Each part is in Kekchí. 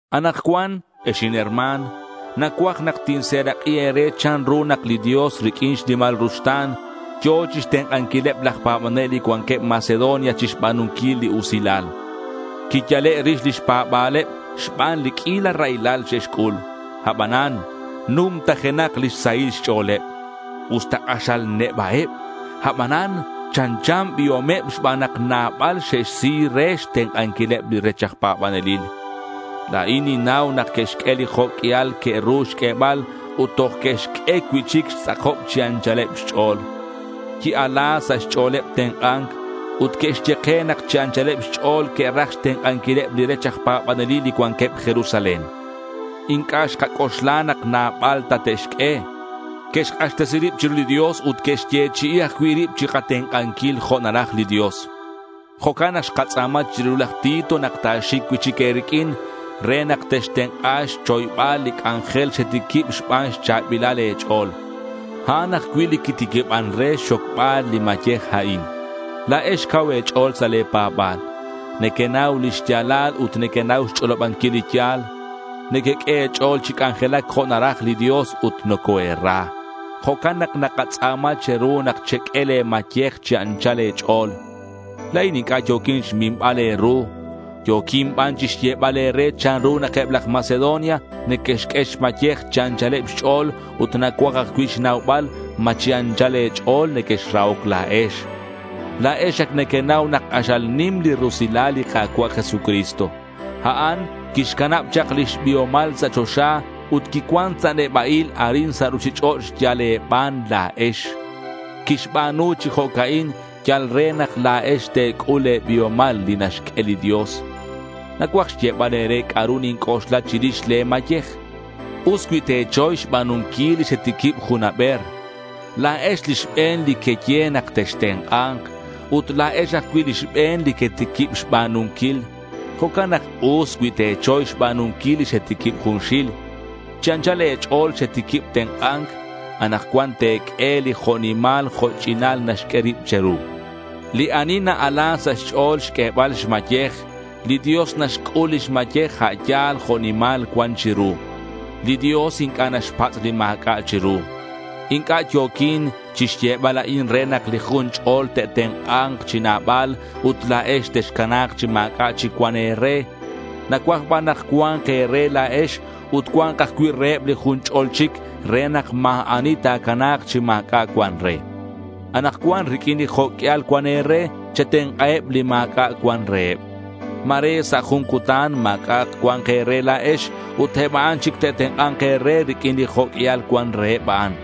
Anakcuan, ex inherma̱n, nacuaj nak tinserak'i e̱re chanru nak li Dios riq'uin xnimal ruxta̱n yo̱ chixtenk'anquileb laj pa̱banel li cuanqueb Macedonia chixba̱nunquil li usilal. Quiyale' rix lix pa̱ba̱leb xban li q'uila raylal xe'xc'ul. Abanan numtajenak lix sahil xch'o̱leb. Usta k'axal neba'eb, abanan chanchan biomeb xban nak nabal xe'xsi re xtenk'anquileb li rech aj pa̱banelil. La̱in ninnau nak que'xq'ue li jo' q'uial que'ru xq'uebal ut toj que'xq'ue cui'chic xtz'akob chi anchaleb xch'o̱l. Qui-ala sa' xch'o̱leb tenk'a̱nc. Ut que'xye ke nak chi anchaleb xch'o̱l que'raj xtenk'anquileb li rech aj pa̱banelil li cuanqueb Jerusalén. Inc'a' xkac'oxla nak nabal ta te'xq'ue. Que'xk'axtesi rib chiru li Dios ut que'xyechi'i ajcui' rib chikatenk'anquil jo' naraj li Dios. Jo'can nak xkatz'a̱ma chiru laj Tito nak ta̱xic cui'chic e̱riq'uin re nak textenk'a xchoybal li c'anjel xetiquib xban xcha̱bilal e̱ch'o̱l. A'an ajcui' li quitiquiban re xxocbal li mayej a'in. La̱ex cau e̱ch'o̱l sa' le̱ pa̱ba̱l. Nequenau li xya̱lal ut nequenau xch'olobanquil li ya̱l. Nequeq'ue e̱ch'o̱l chi c'anjelac jo' naraj li Dios, ut nocoe̱ra. Jo'can nak nakatz'a̱ma che̱ru nak cheq'ue le̱ mayej chi anchal e̱ch'o̱l. La̱in inc'a' yo̱quin xminbal e̱ru. Yo̱quin ban chixyebal e̱re chanru nak eb laj Macedonia neque'xq'ue xmayej chi anchaleb xch'o̱l ut nacuaj ajcui' xnaubal ma chi anchal e̱ch'o̱l nequexrahoc la̱ex. La̱ex ac nequenau nak k'axal nim li rusilal li Ka̱cua' Jesucristo. A'an quixcanab chak lix biomal sa' choxa ut quicuan sa' neba'il arin sa' ruchich'och' yal e̱ban la̱ex. Quixba̱nu chi jo'ca'in yal re nak la̱ex te̱c'ul li biomal li naxq'ue li Dios. Nacuaj xyebal e̱re c'a'ru ninc'oxla chirix le̱ mayej. Us cui te̱choy xba̱nunquil li xetiquib jun haber. La̱ex li xbe̱n li queye nak textenk'a̱nk. Ut la̱ex ajcui' li xbe̱n li quetiquib xba̱nunquil. Jo'can nak us cui te̱choy xba̱nunquil li xetiquib junxil. Chi anchal e̱ch'o̱l xetiquib tenk'a̱nc. Anakcuan te̱q'ue li jo' nimal jo' ch'inal naxq'ue rib che̱ru. Li ani na-ala sa' xch'o̱l xq'uebal xmayej, li Dios naxc'ul lix mayej a' yal jo' nimal cuan chiru. Li Dios inc'a' naxpatz' li ma̱c'a' chiru. Inc'a' yo̱quin chixyebal a'in re nak li jun ch'o̱l te'tenk'a̱k chi nabal ut la̱ex texcana̱k chi ma̱c'a' chic cuan e̱re. Nacuaj ban nak cua̱nk e̱re la̱ex ut cua̱nk ajcui' reheb li jun ch'ol chic re nak ma̱ ani ta̱cana̱k chi ma̱c'a' cuan re. Anakcuan riq'uin li jo' q'uial cuan e̱re, chetenk'aheb li ma̱c'a' cuan reheb. Ma̱re sa' jun cutan ma̱c'a' cua̱nk e̱re la̱ex ut a'an eb chic te'tenk'a̱nk e̱re riq'uin li jo' q'uial cuan reheb a'an.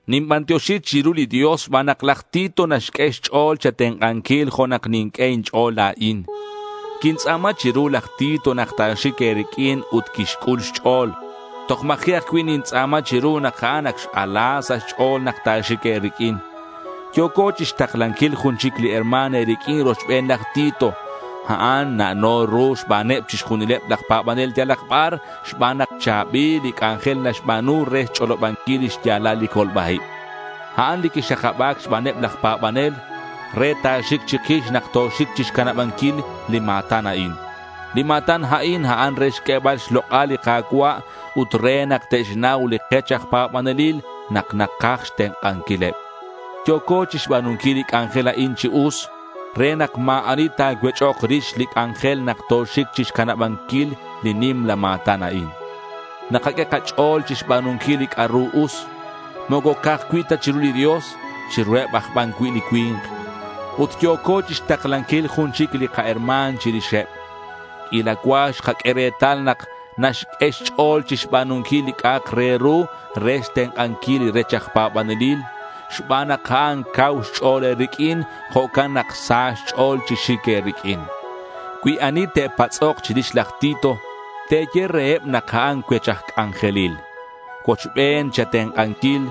Ninbantioxi chiru li Dios xban nak laj Tito naxq'ue xch'o̱l che̱tenk'anquil jo' nak ninq'ue inch'o̱l la̱in. Quintz'a̱ma chiru laj Tito nak ta̱xic e̱riq'uin ut quixc'ul xch'o̱l. Toj ma̱ji' ajcui' nintz'a̱ma chiru nak a'an ac x-ala sa' xch'o̱l nak ta̱xic e̱riq'uin. Yo̱co chixtaklanquil jun chic li herma̱n e̱riq'uin rochben laj Tito. A'an na'no ru xbaneb chixjunileb laj pa̱banel yalak bar xban nak cha̱bil li c'anjel naxba̱nu re xch'olobanquil li xya̱lal li colba-ib. A'an li quixakaba̱c xbaneb laj pa̱banel re ta̱xic chikix nak toxic chixcanabanquil li ma̱tan a'in. Li ma̱tan a'in, a'an re xq'uebal xlok'al li Ka̱cua' ut re nak te'xnau li kech aj pa̱banelil nak nakaj xtenk'anquileb. Yo̱co chixba̱nunquil li c'anjel a'in chi us re nak ma̱ ani ta̱cuech'ok rix li kac'anjel nak toxic chixcanabanquil li nimla ma̱tan a'in. Nakaq'ue kach'o̱l chixba̱nunquil li c'a'ru us; moco ca'aj cui' ta chiru li Dios. Chiruheb aj ban cui' li cui̱nk. Ut yo̱co chixtaklanquil jun chic li kaherma̱n chirixeb. Q'uila cua xkaq'ue retal nak naxq'ue xch'o̱l chixba̱nunquil li c'a'ak re ru re xtenk'anquil li rech aj pa̱banelil. Xban nak a'an cau xch'o̱l e̱riq'uin, jo'can nak sa xch'o̱l chi xic e̱riq'uin. Cui ani te'patz'ok chirix laj Tito, te̱ye reheb nak a'an cuech aj c'anjelil. Cuochben che̱tenk'anquil.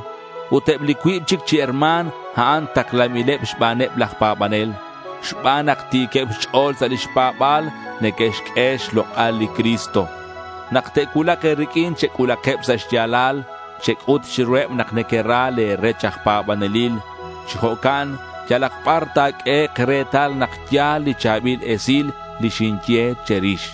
Ut eb li cuib chic chi herma̱n, a'an taklanbileb xbaneb laj pa̱banel. Xban nak ti̱queb xch'o̱l sa' lix pa̱ba̱l, neque'xq'ue xlok'al li Cristo. Nak te'cuulak e̱riq'uin chec'ulakeb sa' xya̱lal. Chec'ut chiruheb nak nequera le̱ rech aj pa̱banelil. Chi jo'can yalak bar ta̱q'uehek' retal nak ya̱l li cha̱bil esil li xinye che̱rix.